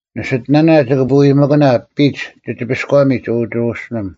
ᓂᓯᑎᓇᓇ ᒋᑭ ᓂᐳᐎᒥᑭᓇ ᐱᒡ ᒋᒋᐱᔎᒥᒡ, ᐅ ᒋᕈᓯᓕᒻ᙮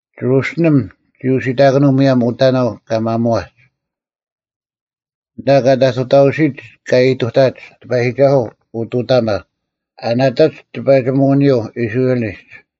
ᒋᕈᓯᓕᒻ ᒋ ᐅᓯᑕᑭᓄᐤ ᒧᔭᒻ ᐅᑕᓇᐤ ᑲ ᒪᒧᐛᒡ, ᐊᓐᑕ ᑲ ᑕᑐᑕᐅᓯᒡ ᑲ ᐃᑐᑕᒡ, ᑎᐸᔨᒋᒐᓱᐤ ᐅᑐᑕᒪ, ᐊ ᓇᑕᒡ ᑎᐸᒋᒧᐅᓂᔪᐤ ᐃᔅᕋᐃᓚᒡ,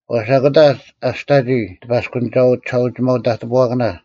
ᐛᔅ ᐊᑯᑕ ᐊᔅᑕᒋ ᑎᐸᔅᑯᓂᒐᐤ ᒋᓴᐅᒋᒪᐤ ᑕᑎᐳᐛᑭᓇ,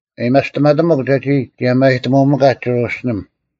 ᐊᔭᒥᐊᔅᑎᒪᑎᒧᒄ ᒐᒋ ᒋᔭᒪᔨᑎᒧᒥᑲᒡ ᒋᕈᓯᓕᒻ;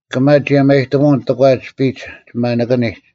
ᑭᒪ ᒋᔭᒪᔨᑎᒧᐅᓐ ᑎᒂᒡ ᐱᒡ ᒋ ᒪᓂᑭᓂᒡ,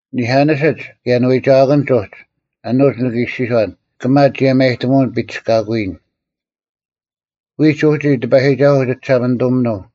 ᓂᐧᑲᓂᓯᒡ ᑭᔭ ᓂᐎᒐᐛᑭᓐᒡ ᐅᒡ, ᐊᓄᒡ ᓂᑭ ᐃᔅᒋᔄᓐ, “ᑭᒪ ᒋᔭᒪᔨᑎᒧᐅᓐ ᐱᒋᔅᑲᑯᔨᓐ᙮” ᐎᒡ ᐅᒋ ᑎᐸᔨᒋᒐᓱᐤ ᒋᒋᓴᒪᓂᑐᒥᓄᐤ,